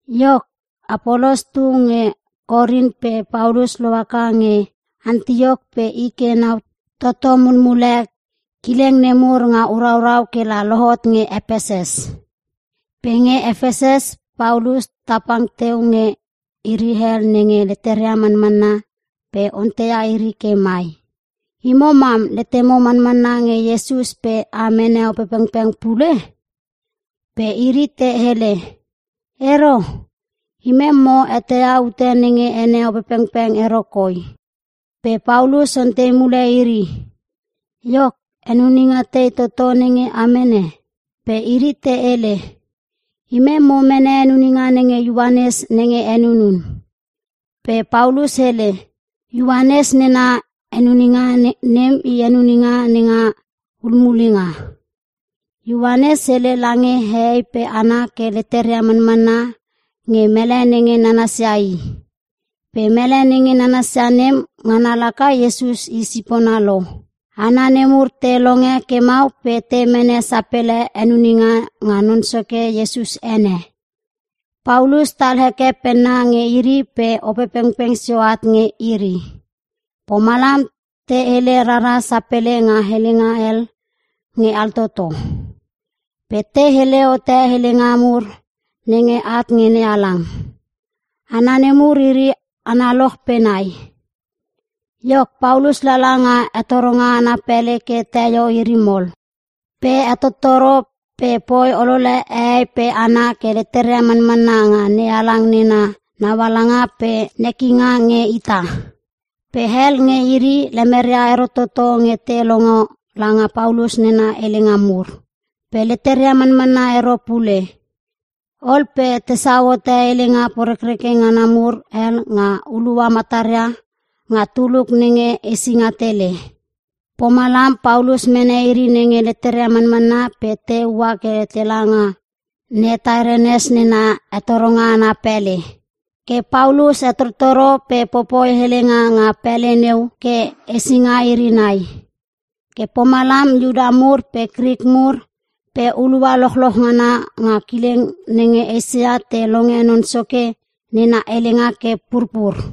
Iok, Apolos tu nge Korin pe Paulus lohaka nge Antiok pe i ke nau toto mulmule kileng nemur nga uraurau kela lohot nge Epeses. Pe nge Epeses Paulus tapang teu nge iri hel nenge leteria manmanna pe onteia iri ke mai, “Imo mam letemo manmanna nge Iesus pe a mene Opepengpeng pule?” Pe iri te hele, “Ero! Imem mo eteia ute nenge ene Opepengpeng ero koi.” Pe Paulus ontei mule iri, “Iok, henuninga tei toto nenge a mene?” Pe iri te hele, “Imem mo mene henuninga nenge Ioanes nenge henunun.” Pe Paulus hele, “Ioanes nena henuninga nem i henuninga nenga hulmulenga. Ioanes hele lange hehei pe hana ke leteria manmanna nge mele nenge nanasia i. Pe mele nenge nanasia nem ngana laka Iesus i sipona lo.” Hana nemur te longe ke mau pe te mene sapele henuninga nga Non Soke Iesus ene. Paulus tal heke penna nge iri pe Opepengpeng sio at nge iri. Pomalam te hele rara sapele nga helenga hel nge altoto. Pe te hele hote helenga mur nenge at nge NeHalang. Hana nemur iri analoch pe nai. Iok Paulus lala nga hetoronga ana pele ke teio iri mol. Pe hetottoro pe poi olole hehei pe hana ke leteria manmanna nga NeHalang nena naualanga pe nekinga nge ita. Pe hel nge iri lemeria ero toto nge te longo langa Paulus nena helenga mur. Pe leteria manmanna ero pule. Ol pe tesau hote helenga porekreke ngana mur hel nga hulua mataria nga tuluk nenge Esinga Tele. Pomalam Paulus mene iri nenge leteria manmanna pe te ua ke tela nga Ne Tairenes nena hetoronga ana pele. Ke Paulus hetottoro pe popoi helenga nga pele neu ke hesinga iri nai. Ke pomalam Iuta mur pe Krik mur pe hulua lochloch ngana nga kileng nenge Eisia te longe Non Soke nena helenga ke purpur.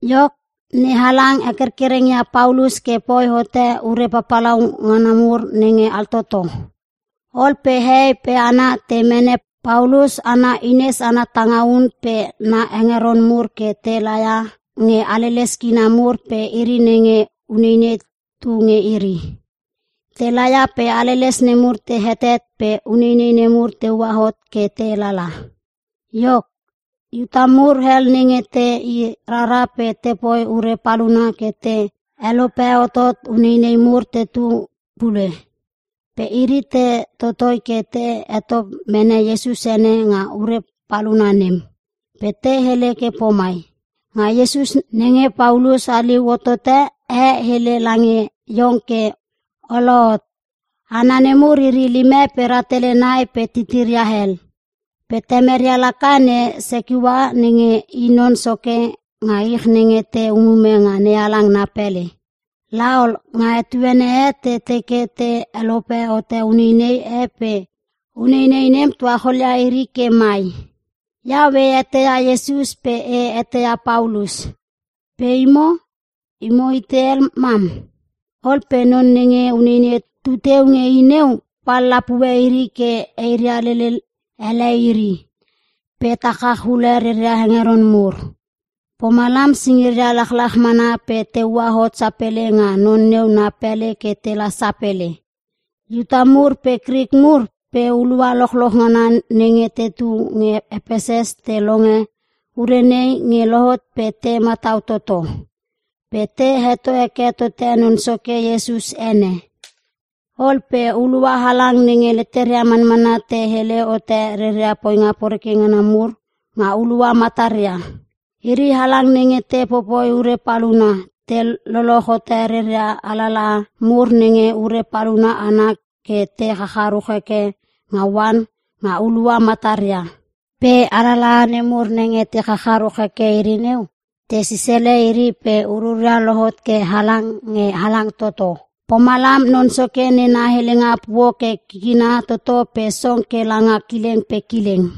Iok, NeHalang hekerkereng ia Paulus ke poi hote ure papalauna mur nenge altototo. Ol pe hehei pe hana te mene Paulus ana hines ana tangaun pe na hengeron mur ke te laia nge haleles kina mur pe iri nenge uneinei tu nge iri. Te laia pe haleles nemur te hetet pe uneinei nemur teua hot ke te lala. Iok, Iuta mur hel nenge te i rara pe tepoi ure paluna ke te helope hotot uneinei mur tetu pule. Pe iri te totoi ke te heto mene Iesus ene nga ure paluna nem. Pe te hele ke pomai, “Nga Iesus nenge Paulus haliu hotote, e hele lange iong ke olohot!” Hana nemur iri lime pe rahtele nai pe titiria hel. Pe temeria laka, ne Sekeua nenge i non soke nga iri nenge te umume nga NeHalang na pele. La ol, nga etuene e te teke te helope hote uneinei e pe uneinei nem tuacholia iri ke mai, “Iau e eteia Iesus pe e eteia Paulus. Pe imo? Imo itei hel mam?” Ol pe non nenge uneinei tuteu nge i neu pal lapue iri ke eiria lele ele iri, pe ta chach ule reria hengeron mur. Pomalam singiria lachlach mana pe teua hot sapele nga non neu na pele ke tela sapele. Iuta mur pe Krik mur pe hulua lochloch ngana nenge tetu nge Epeses te longe ure nei nge lohot pe te matau toto. Pe te heto heke tote Non Soke Iesus ene. Ol pe hulua halang nenge leteria manmanna te hele hote reria poinga poreke ngana mur nga hulua mataria. Iri halang nenge te popoi ure paluna, te loloch hote reria alalaha mur nenge ure paluna ana ke te chacharuch heke nga oan nga hulua mataria. Pe alalaha nemur nenge te chacharuch heke iri neu, te sisele iri pe ururia lohot ke halang nge halang toto. Pomalam Non Soke nena helenga puo ke kikina toto pe song ke langa kileng pe kileng.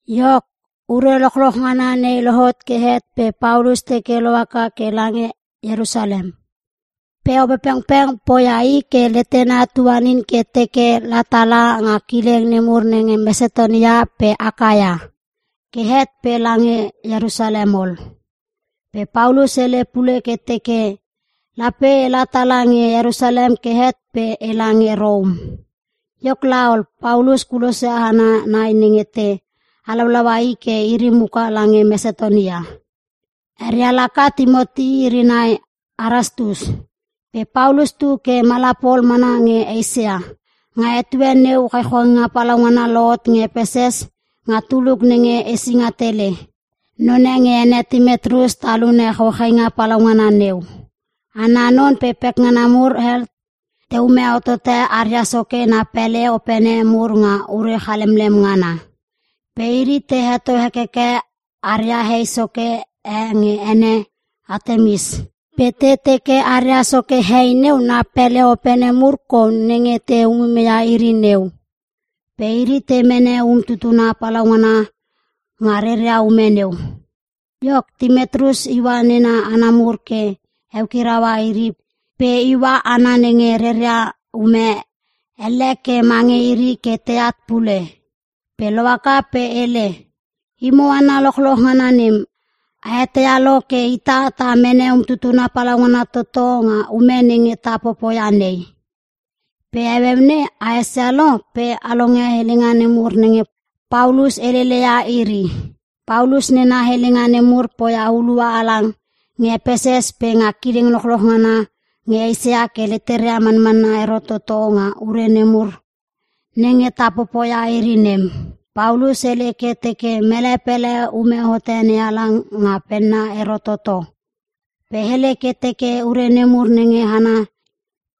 Iok, ure lochloch ngana nei lohot ke het pe Paulus teke lohaka ke lange Ierusalem. Pe Opepengpeng poia i ke letena tuanin ke teke la tala nga kileng nemur nge Mesatonia pe Akaia. Ke het pe lange Ierusalem ol. Pe Paulus hele pule ke teke, “Lape ela tala nge Ierusalem ke het pe ela nge Rom.” Iok laol Paulus kulosia hana nai nenge te halaulaua i ke iri muka lange Mesatonia. Eria laka Timoti iri nai Erastus. Pe Paulus tu ke mala pol mana nge Eisia. Nga etue neu chauchainga palaungana lohot nge Epeses nga tuluk nenge Esinga Tele. Non e nge ene Timetrius talune chauchainga palaungana neu. Ana non pe pekngana mur hel teume hotote aria soke na pele opene mur nga ure chalemlem ngana. Pe iri, te heto hekeke aria hei soke e nge ene Atemis. Pe te teke aria soke hei neu na pele opene mur kou nenge te umume ia iri neu. Pe iri te mene um tutuna palaungana nga reria ume neu. Iok, Timetrius iua nena hana mur ke eukiraua iri pe iua hana nenge reria ume elle ke mange iri ke teat pule. Pe lohaka pe hele, “Imo hana lochloch ngana nem, a eteia lo ke ita ta mene umtutuna palaungana toto nga ume nenge ta popoia nei. Pe heueu nei a esia lo, pe a longe helenga nemur nenge Paulus heleleia iri. Paulus nena helenga nemur poia hulua halang nge Epeses pe nga kileng lochloch ngana nge Eisia ke leteria manmanna ero toto nga ure nemur nenge ta popoia iri nem. Paulus hele ke teke mele pele ume hote NeHalang nga penna ero toto. Pe hele ke teke ure nemur nenge hana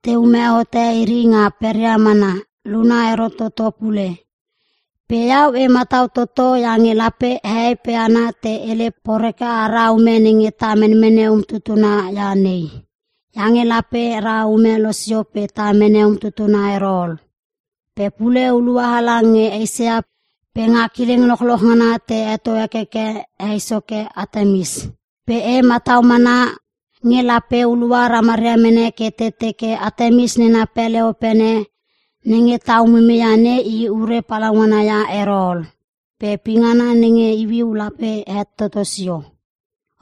teume hote iri nga peria mana, luna ero toto pule. Pe iau e matau toto iange lape hehei pe hana te hele poreke ara ume nenge ta menmene umtutuna ia nei. Iange lape ra ume losio pe ta mene umtutuna ero ol. Pe pule, hulua halang nge Eisia pe nga kileng lochloch ngana te heto hekeke hei soke Atemis. Pe e matau mana nge lape hulua ramaria mene ke te teke Atemis nena pele opene nenge ta umumeia nei i ure palaungana ia ero ol. Pe pingana nenge iuiu lape het toto sio.”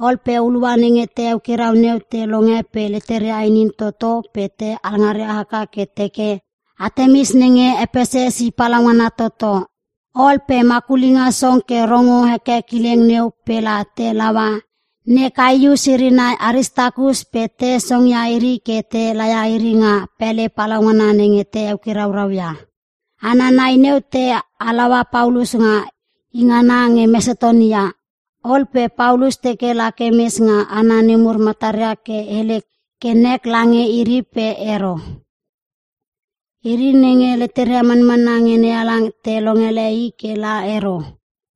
Ol pe hulua nenge te eukirau neu te longe pe leteria inin toto pe te alngaria haka ke te teke, “Atemis nenge Epeses i palaungana toto!” Ol pe makulinga song ke rongo heke kileng neu pela te laua ne Kaius irinai Aristakus pe te songia iri ke te laia iri nga pele palaungana nenge te eukiraurau ia. (hana nai neu te halaua Paulus nga i ngana nge Mesatonia) Ol pe Paulus teke lake mes nga hana nemur mataria ke hele ke nek lange iri pe ero. Iri nenge leteria manmanna nge NeHalang te longele i ke la ero.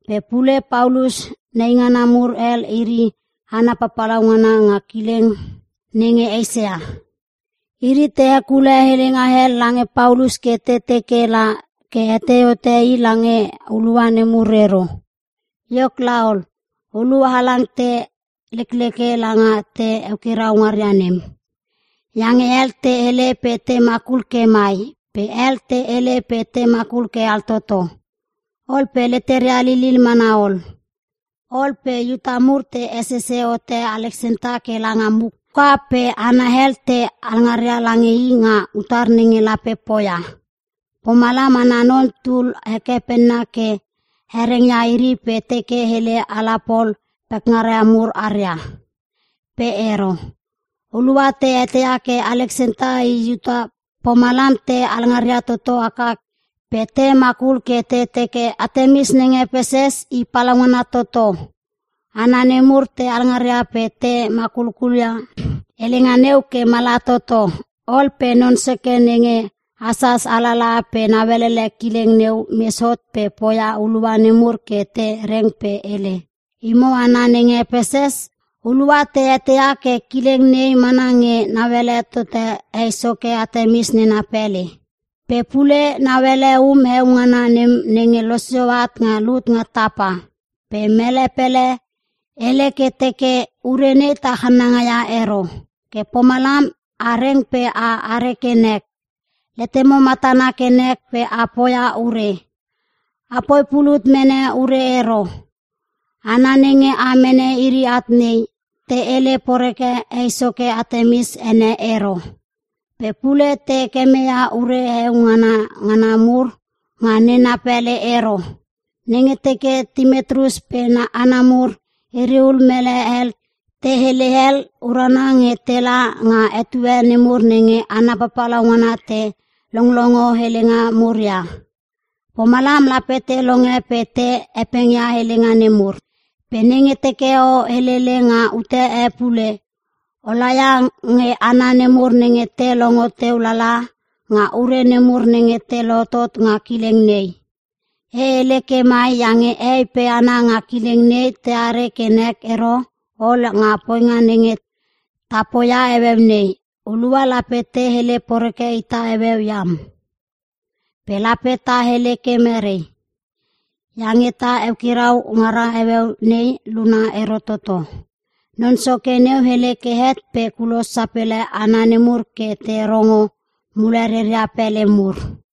Pe pule, Paulus neingana mur hel iri hana papalauna nga kileng nenge Eisia. Iri te hekule helenga hel lange Paulus ke te teke la ke hetei hote i lange hulua nemur ero. Iok laol, hulua halang te lekleke langa te eukirau ngaria nem. Iange hel te hele pe te makul ke mai, pe hel te hele pe te makul ke altoto. Ol pe leteria lilil mana ol. Ol pe Iuta mur te hesisi hote Aleksenta ke langa muka, pe hana hel te alngaria lange i nga utar nenge lape poia. Pomalam ana non tul heke penna ke hereng ia iri pe teke hele ala pol pekngaria mur aria. Pe ero. Hulua te eteia ke Aleksenta i Iuta, pomalam te alngaria toto haka pe te makul ke te teke, “Atemis nenge Epeses i palaungana toto!” Hana nemur te alngarngaria pe te makulkulia helenga neu ke mala toto. Ol pe non soke nenge hasas alalaha pe nauelele kileng neu mes hot ke poia hulua nemur ke te reng pe hele, “Imo hana nenge Epeses, hulua te eteia ke kileng nei mana nge nauele tote hei soke Atemis nena pele. Pe pule, nauele um heo ngana nem nenge losio at nga lut nga tapa. Pe mele pele hele ke teke urenei ta channangaia ero. Ke pomalam a reng pe a are ke nek. Letemo matana ke nek pe a poia ure. Apoi pulut mene ure ero. Hana nenge a mene iri at nei, te hele poreke hei soke Atemis ene ero. Pe pule te kemeia ure heo ngana ngana mur nga nena pele ero. Nenge teke Timetrius pe na hana mur iriul mele hel te hele hel, urana nge tela nga etue nemur nenge hana papalauna te longlongo helenga mur ia. Pomalam lape te longe pe te hepengia helenga nemur. Pe nenge teke o helele nga ute e pule, o laia nge hana nemur nenge te longo teu lala nga ure nemur nenge te lohotot nga kileng nei. E hele ke mai iange hehei pe hana nge kileng nei teare ke nek ero ol nga poinga nenge ta poia heueu nei. Hulua lape te hele poreke ita heueu iam. Pe lape ta hele ke mere? Iange ta eukirau ngara heueu nei, luna ero toto.” Non soke neu hele ke het pe kulos sapele hana nemur ke te rongo mule reria pele mur.